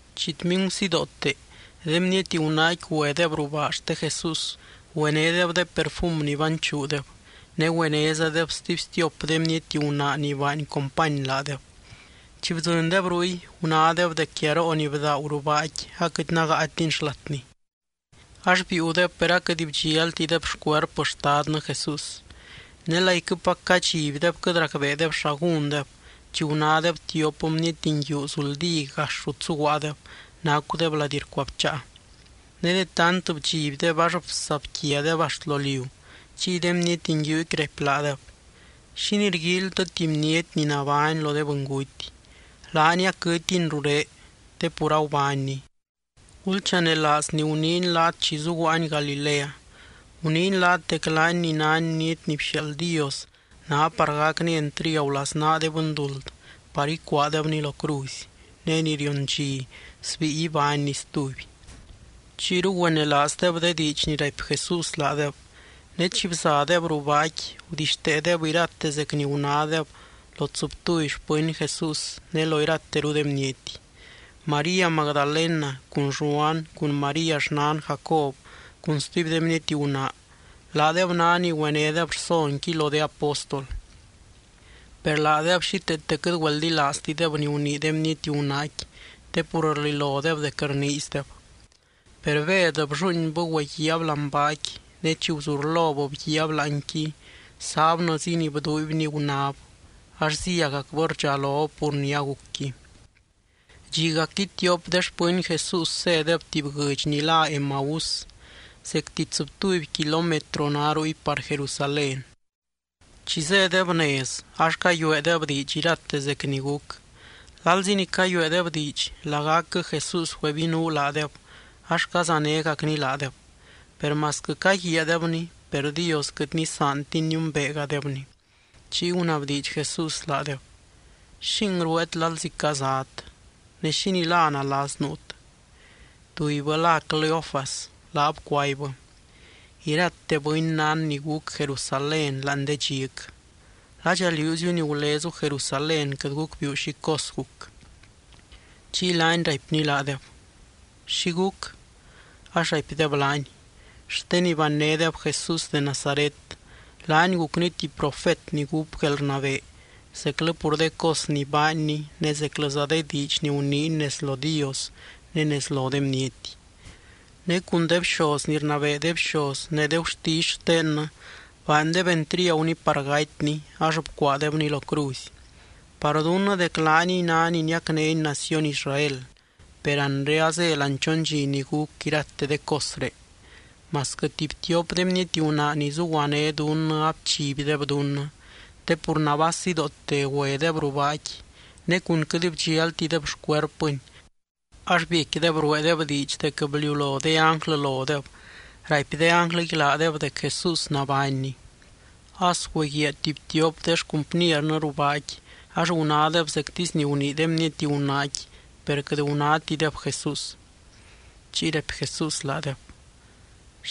Chitmingu sidoote, de bniety gunaaqui güedeb ruu baa xte Jesús, güenédeb de perfum ni banchuudeb. Ne güenézadeb stuby stiop de bniety gunaa ni baany company laadeb. Chi bdzɨndeb ruy, gunádeb dec guiaroo ni bdaagu ruu baaqui aquɨt nágaatini xlatni. Ax biiudeb per aquɨt bdxialtideb xcuerpɨ Xtadnɨ Jesús. Ne laiquɨpac cadxibdeb quɨt racbeedeb xa gúndeb, chi gunádeb tiop bniety nguiu zuldí gax rut zuguaadeb, nacudeb lady rcuabcháa. Ne de tant bdxibdeb ax bsabquiadeb axt lo liu, chiy de bniety nguiuqui raipy laadeb: —¿Xínii rguíilytɨ tuby bniety ni nabány lo de bɨnguty? Laany aquɨtiny ruré, te pur agubánny. Gulchanelaaz ni guniiny laat chi zuguaany Galilea. Guniiny laat dec laany ni nány Bniety ni bxiaald Dios, ná par gacny entriagu laznaa de bɨnduld, par icuaadebny lo cruzy, ne ni rion dxi, sbíi ibánny stuby. Chiyru güenelaazdeb de diidx ni raipy Jesús laadeb, ne chi bzadeb ruu baaqui gudixteedeb irate zec ni gunádeb lo tsɨbtuby xpɨny Jesús ne lo irateru de bniety. María Magdalena, cun Lluan, cun María xnan Jacob, cun stuby de bniety gunaa, laadeb ná ni güenédeb rsonqui lo de apóstol. Per laadeb xíteete quɨt güeldilaaztideb ni gunii de bniety gunaaqui te pur rlilodeb dec rniizideb. Per Bed blluuinbɨ güeguiaab láani baaqui. Ne chi guzurlob bguiaab láanqui, sábnɨzi ni bduuibny gunáb, ax zíagacbɨ rdxalob pur ni agucqui. Dxigacqui, tiop de xpɨny Jesús zédeb tuby guɨdx ni lá Emaús, zecti tsɨbtuby kilómetro ná ruy par Jerusalén. Chi zédeb nez ax cayueedeb diidx irate zec ni guc. Lalzi ni cayueedeb diidx, lagacquɨ Jesús güebinuu laadeb ax cazanégacny laadeb. Per masquɨ caguiaadebny, per Dios quɨt nisaantiny niumbeegadebny. Chiy gunabdiidx Jesús laadeb: —¿Xing rueet lalzi cazat? Ne, ¿xínii la nalas nuut? Tubybɨ lá Cleofas, laab cuaibbɨ: —Irate bɨny nán ni guc Jerusalén láani de dxic. ¿Ladxa liúziu ni gulezu Jerusalén quɨt gucbiiu xi cos guc? Chiy laany raipny laadeb: —¿Xi guc? Ax raipdeb laany: —Xte ni bannédeb Jesús de Nazaret, laany gucny tuby profet ni gúp guelrnabee zeclɨ pur de cos ni baanny ne zeclɨza de diidx ni guniiny nez lo Dios ne nez lo de bniety. Ne cun de bxoz ni rnabee de bxoz ne de gurtisy xtennɨ baandeb entriaguny par gatyny ax bcuaadebny lo cruzy. Par dunnɨ dec laaniy ná ni niacnény naciony Israel. Per anre azé láani chon dxi ni guc irate de cosré. Masquɨ tuby tiop de bniety gunaa ni zuguané dunnɨ abchibdeb dunnɨ, te pur nabaa sidoote güedeb ruu baaqui, ne cun quɨt bdxialtideb xcuerpɨny, ax biecquideb rueedeb diidx dec bliulo de ánglɨ lodeb raipy de ánglɨqui laadeb dec Jesús nabánny. As güeguiaa tuby tiop de xcumpniernɨ ruu baaqui ax gunádeb zectisy ni gunii de bniety gunaaqui, per quɨt gunátideb Jesús. Chiy raipy Jesús laadeb: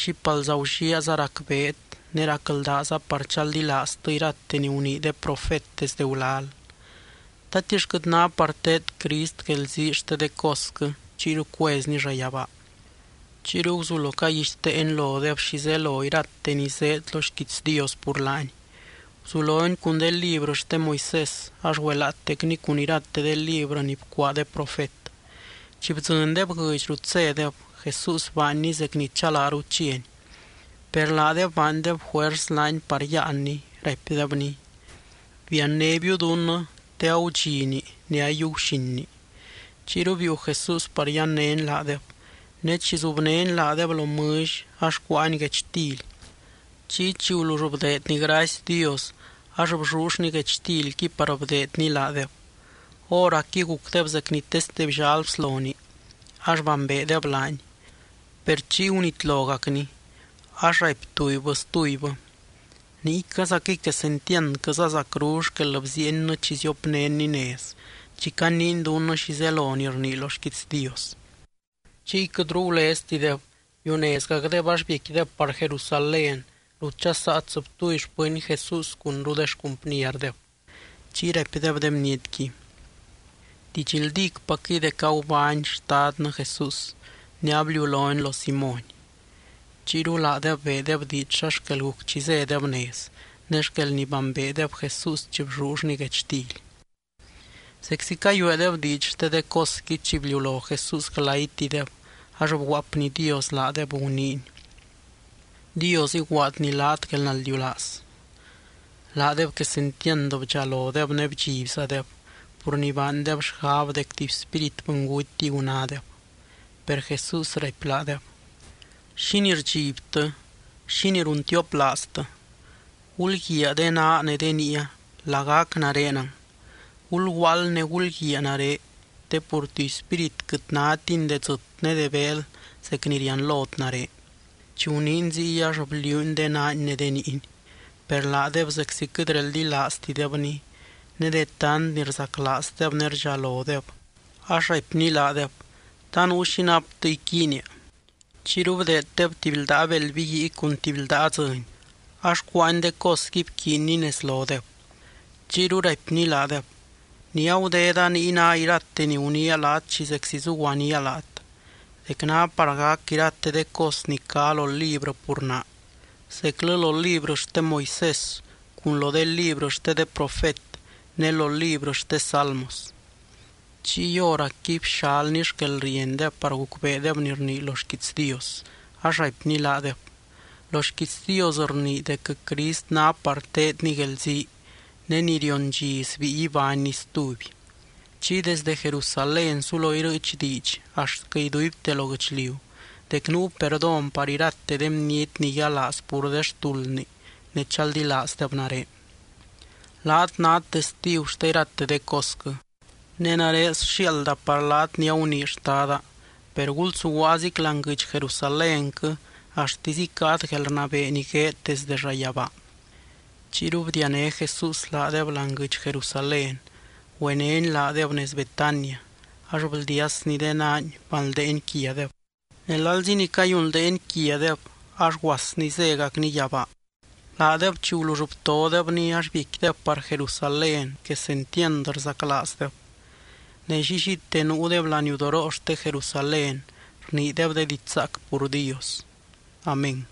—¡Xípalza gulliaaza racbeet ne racldaaza par chaldilaaztɨ irate ni gunii de profet desde gulal! ¿Tatix quɨt ná par teed Crist guelzii xte de cosquɨ chiyru cuezny llayabaa? Chiyru guzulo caguixteeny lodeb xi zelo irate ni zéed lo xquiits Dios pur laany. Guzulony cun de librɨ xte Moisés ax güelaatecny cun irate de librɨ ni bcuaa de profet. Chi bdzɨndeb guɨdx rut zédeb, Jesús baanny zec ni chalaaru chiany. Per laadeb baandeb juers laany par yáanny, raipdebny: —Biannébiu dunnɨ, te agudxini, ne ayiiu guxinni. Chiyru biiu Jesús par yannény laadeb. Ne chi zubnény laadeb lo mɨlly ax cuáany guechtily, chiy chi gulull bdeedny gracy Dios ax bllullny guechtilqui par bdeedny laadeb. Hóracqui gucdeb zec ni teste bllal bsloni ax bambeedeb laany. Per chiy gunitlogacny, ax raipy tubybɨ stubybɨ: —¡Niycazaquɨy quesentiandquɨza zacru xquel bziiennɨ chi ziopnénny nez, chi caniiny dunnɨ xi zelo ni rnii lo xquiits Dios! Chiy quɨtru guleztideb, biunezgacdeb ax biecquideb par Jerusalén, rut dxasaa tsɨbtuby xpɨny Jesús cunru de xcumpnierdeb. Chiy raipdeb de bnietqui: —Didxldícpacquɨy dec agubány Xtadnɨ Jesús, ne abliulony lo Simóny. Chiyru laadeb beedeb diidx xa xquel guc chi zédeb nez, ne xquel ni bambeedeb Jesús chi bllullny guechtily. Zeczi cayueedeb diidx xte de cosqui, chi bliulo Jesús glaytideb ax bguaapnydios laadeb guniiny: —Dios iguaadny laat guelnaldiulaaz. Laadeb quesentiand bdxalodeb ne bdxibzadeb, pur ni baandeb xgab dec tuby spírit bɨngutiy gunádeb. Per Jesús raipy laadeb: —¿Xínii rdxibtɨ? ¿Xínii runtioplaaztɨ? Gulguiaa de naa ne de niia. Lagac narenɨng. Gulguaald ne gulguiaa nare, te pur tuby spírit quɨt nátini de dzɨt ne de beel zec ni rianlot nare. Chi guniiny ziy ax bliuuny de naany ne de niiny. Per laadeb zeczi quɨt reldilaaztidebny ne de tant ni rzaclaazdeb ne rdxalodeb, ax raipny laadeb: —¿Ta nuu xi naptɨ iquiinia? Chiyru bdeeddeb tuby ldaa beld biguii cun tuby ldaa dzɨny, ax cuánny de cosqui bquiiny nez lodeb. Chiyru raipny laadeb: —Ni agudeda niy ná irate ni guniia laat chi zeczi zuguaníaa laat: dec ná par gac irate de cos ni cá lo librɨ pur naa, zeclɨ lo librɨ xte Moisés cun lo de librɨ xte de profet, ne lo librɨ xte salmos. Chiy hóracqui bxalny xquelriendeb par gucbeedeb ni rnii lo xquiits Dios, ax raipny laadeb: —Lo xquiits Dios rnii dec Crist ná par teedny guelzii, ne ni rion dxi, sbíi ibánny stuby. Chiy desdɨ Jerusalén sulo irɨɨch diidx axtquɨ iduibte lo guɨchliu, dec nuu perdón par irate de bniety ni yialaaz pur de xtuldni ne chaldilaazdeb nare. Laat nát testigu xte irate de cosquɨ. Ne nare sxiaalda par laat ni agunii Xtada. Per gulsuguaazic láani guɨdx Jerusalénquɨ axtisy icáat guelrnabee ni gueed desde llayabaa. Chiyru bdiané Jesús laadeb láani guɨdx Jerusalén, güenény laadeb nez Betania, ax bldiasny de naany banldeeny quiadeb. Ne lalzi ni cayunldeeny quiadeb, ax guasny zégacny yabaa. Laadeb chi gulull btodebny ax biecquideb par Jerusalén quesentiand rzaclaazdeb. Ne llillite nuudeb laniudoroo xte Jerusalén rniideb de diidx zaac pur Dios. Amén.